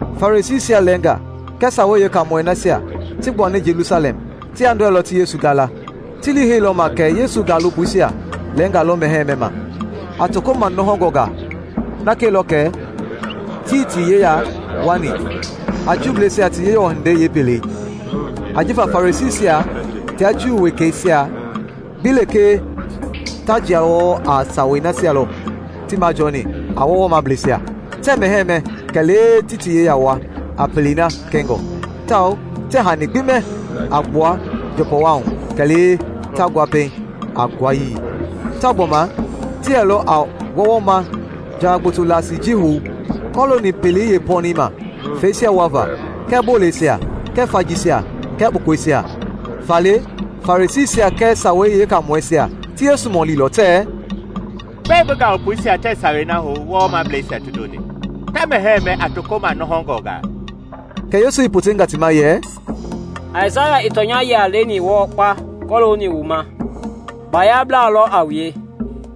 Farisiisia lɛɛnga kɛɛ Sawei Yeekaamɔi nasia ti gbuani Jelusalɛm ti yandɔɛilɔ ti Yesu gala. Ti lii heilɔ ma kɛ Yesu gaalopoisia lɛɛnga lɔ mɛhɛɛ mɛma a toko manɔhɔngɔngaa na kɛilɔ kɛ tii ti yeya wuani a Juubleisia ti Yewɔ hindei yeepelei. Ajifa Farisiisia tia Juu wekeisia gbi lekee ta jia wɔɔ a sawei nasia lɔ ti majɔni a wɔwɔmableisia: tɛɛ mɛhɛɛ mɛ kɛlee ti ti yeya wua a pelei na kɛngɔ; tawao tɛɛ hani gbi mɛ a gbua njɔpɔwahu kɛlee ta ngua pɛiŋ a nguayii; tawao gbɔma ti yɛlɔ a wɔwɔma jawa gboto laasii ji hou kɔlooni pelei yeepɔnɛi ma feisia wuava kɛɛ boleisia kɛɛ fajiisia kɛɛ kpukɔisia. Faale, Farisiisia kɛɛ Sawei Yeekaamɔisia ti Yesu mɔlilɔ tɛɛ, “Gbɛe bi gaalopoisia tɛɛ sawei na hou wɔwɔmableisia ti ndoni, ta mɛhɛɛ mɛ a toko manɔhɔngɔngaa?” Kɛ Yesu i potenga ti ma yɛ, “Aisaya i tɔnya-yia leni wɔɔ kpa kɔlooni wu ma! Bayablaa lɔ a wue,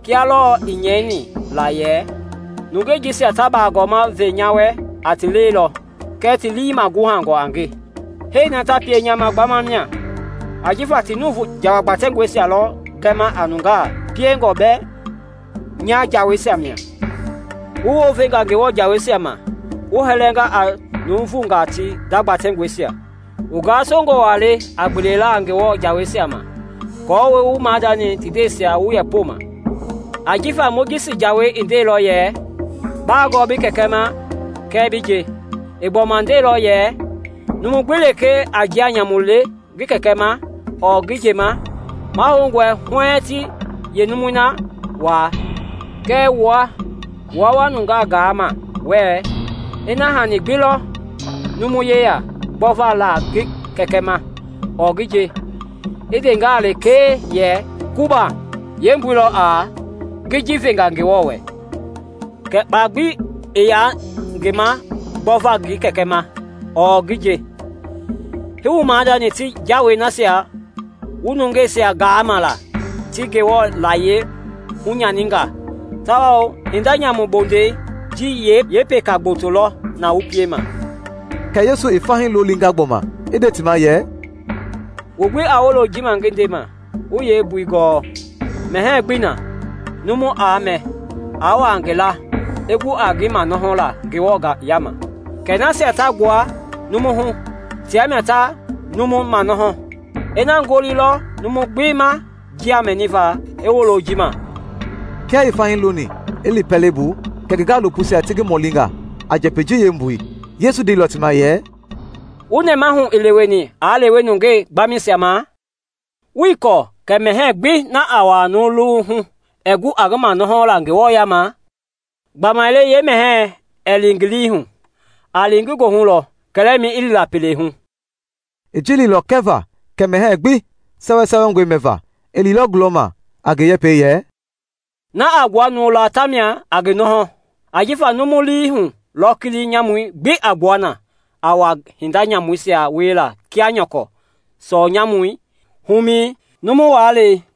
kia lɔɔ i nyɛini la yɛ, ‘Nungei jisia ta bagɔma ve nya wɛ a ti lɛi lɔ kɛɛ ti lii maguhangɔ a nge. Hee na ta pie nya ma gbama mia ajifa ti nuuvu jawa gbatɛngɔisia lɔ gɛma a nungaa piengɔ bɛɛ nya jaweisia mia!’ “Wu wounvenga Ngewɔ jaweisia ma, wu hɛlɛnga a nuuvungaa ti nda gbatɛngɔisia. Wu gasongɔ wa le a gbelela Ngewɔ jaweisia ma aako wu wu maadani ti ndɛisia wu yeepomɛi! Ajifa Mojisi jawei i ndeilɔ yɛ, ‘Baagɔɔ bi kɛkɛ ma kɛɛ bi nje;’ i gbɔma nde yɛ, ‘Numu gbi lekee a njia nyamu le ngi kɛkɛ ma ɔɔ ngi nje, mahoungɔi huɛɛŋ ti yeenumui na waa;’ kɛɛ wua, wua nungaa gaama wɛɛ, Ina hani gbi lɔ numu yeya gbɔva la ngi kɛkɛ ma ɔɔ ngi nje, i ndengaa lekee yɛ ‘Kɔban’ (yeembui lɔ a ‘ngi ji venga Ngewɔ wɛ’), kɛ kpa gbi ii yaa ngi ma gbɔva ngi kɛkɛ ma ɔɔ ngi nje. Hii wu maadani ti jawei nasia wu nungeisia gaama la ti Ngewɔ layie hunyaninga. Tawao hinda nyamu bondei ji yeepeka gboto lɔ na wu piema.” Kɛ Yesu i fahii lolinga gbɔma i nde ti ma yɛ, “Wu gbi a wolo ji ma ngi ndema, wu yeembui gɔɔ. Mɛhɛɛ gbii na numu aa mɛ, i wua ngi laa, i gu a ngi manɔhɔla Ngewɔ yaama; kɛ nasia ta gbua numu hu, tia mia ta numu manɔhɔ. [ Ina ngoli lɔ numu gbi ma njia mɛniva, i wolo ji ma.]” Kia i fahii loni i li pɛlei bu, kɛ ngi gaalopoisia ti ngi mɔlinga a njɛpɛi ji yeembui. Yesu ndeilɔ ti ma yɛ, “Wu nɛmahu ii leweni aa lewe nungaa gbamɛisia ma? Wuii kɔɔ kɛ mɛhɛɛ gbii na aa wua numu luwui hu aa gu a ngi manɔhɔla Ngewɔ yama? Gbamaile yeemɛhɛi ɛɛ li ngi lii hu, a li ngi goohu lɔ, kɛlɛmɛi i li la pele hu.” (I ji leilɔ kɛva kɛ mɛhɛɛ gbi sɛwɛsɛwɛngɔe mɛva.) I liilɔ gulɔma a ngi yɛpɛi yɛ, “Na a gbua numu laa tamia a ngi nɔhɔ. Ajifa numu lii hu lɔ kili nyamui gbi a gbua na a wa a hinda nyamuisia wiela kia nyɔkɔ sɔɔ nyamui, humɛi, numu waalɛi,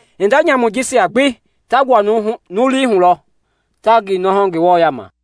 Hinda nyamui jisia gbi ta gbua numu lii hu lɔ ta ngi nɔhɔ Ngewɔ yaama.”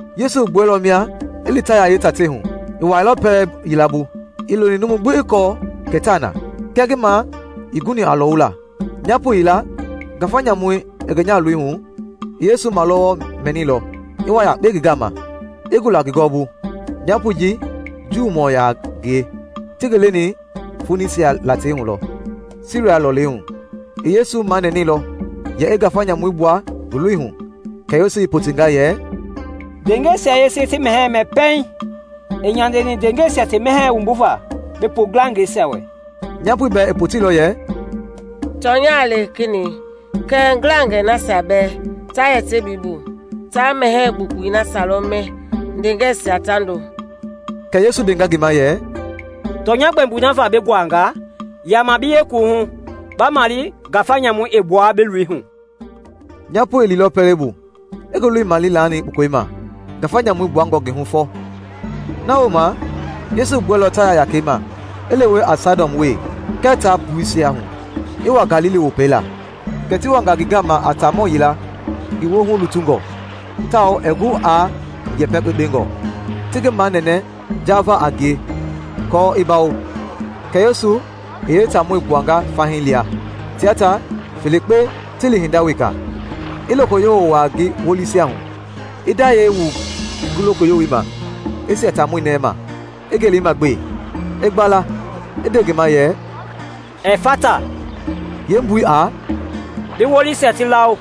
Yesu i gbuɛilɔ mia i li Taya yeetatei hu. I wuailɔ pɛlɛ yila bu, ii loni numu gbi i kɔɔ kɛ taa na, kɛɛ ngi ma ii guni a lɔwula. Nyapo yila, ngafa nyamu i ngi nyahaloi hu, i Yesu malɔwɔ mɛnilɔ, i wa yakpe ngi gama, i gula ngi gɔwɔbu. Nyapoi ji juumɔ yaa ngie, ti ngi leni Fonisia latei hu lɔ, Siria lɔlei hu. I Yesu manɛnɛilɔ yɛ i ngafa nyamui gbua ngi loi hu. Kɛ Yesu i potenga yɛ, “Ndeengɛisia yese ti mɛhɛɛ mɛ pɛiŋ. Ii nyandeni ndeengɛisia ti mɛhɛɛi wumbuva bi pu ngilangɛisia wɛ.” Nyapoi bɛɛ i poteilɔ yɛ, “Tɔnya le, Kenɛi, kɛɛ ngilangɛi nasia bɛɛ ta yɛ tebii bu ta mɛhɛɛ gbukpui nasia lɔ mɛ ndeengɛisia ta ndo.” Kɛ Yesu ndenga ngi ma yɛ, “Tɔnya gbɛmboi na va bi nguanga, yama bi yekuwuhu ba male ngafa nyamui i gbuanga bi loi hu.” Nyapoi i liilɔ pɛlei bu i ngi loi male i laani kpukɔi ma ngafa nyamui gbuangɔ ngi hu fɔ. Na wooma Yesu i gbuailɔ Taya yakɛi ma i lewe a Saidɔn wee kɛɛ taa Puisia hu, i wa Galili Wopei la. Kɛ ti wanga ngi gama a taamɔ yila ngi woohu lutungɔ; tawao ɛɛ gu aa yɛpɛ kpekpengɔ, ti ngi manɛnɛ jaava a ngie aako i bawo. Kɛ Yesu i yee taamɔi gbuanga fahii lia, tia ta felekpe ti li hinda weka, i lokoyowo wua ngi wolisia hu, i ndayɛi wu ngi lokoyowoi ma i sia taamɔi nɛi ma, i ngelema gbe, i gbala, i nde ngi ma yɛ, “Ɛfata!” Yeembui a “Bi wolisia ti lawo.”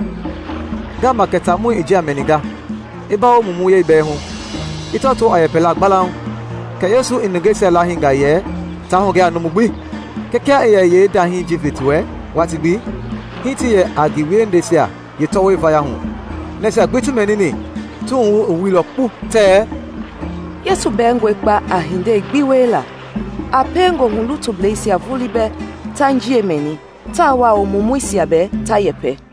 Ngama kɛ taamɔi i njia mɛninga, i bawo mumuyɛi bɛɛ hu, i tɔtoo a yɛpɛla gbalauŋ. Kɛ Yesu i nungeisia lahinga yɛ taa hugɛ a numu gbi; kɛɛ kia i yɛ yee ndahii ji ve ti wɛ watii gbi, hii ti yɛ a ngi wiehindeisia yeetɔwɔi vaya hu. Nasia gbi ti mɛnini, ti wuhu i wuilɔ kpu tɛɛ, “Yesu bɛɛngɔe kpa a hindei gbi wiela! A pie ngoohulutublɛisia vulii bɛɛ ta njia mɛni, tawao mumuisia ta yɛpɛ!”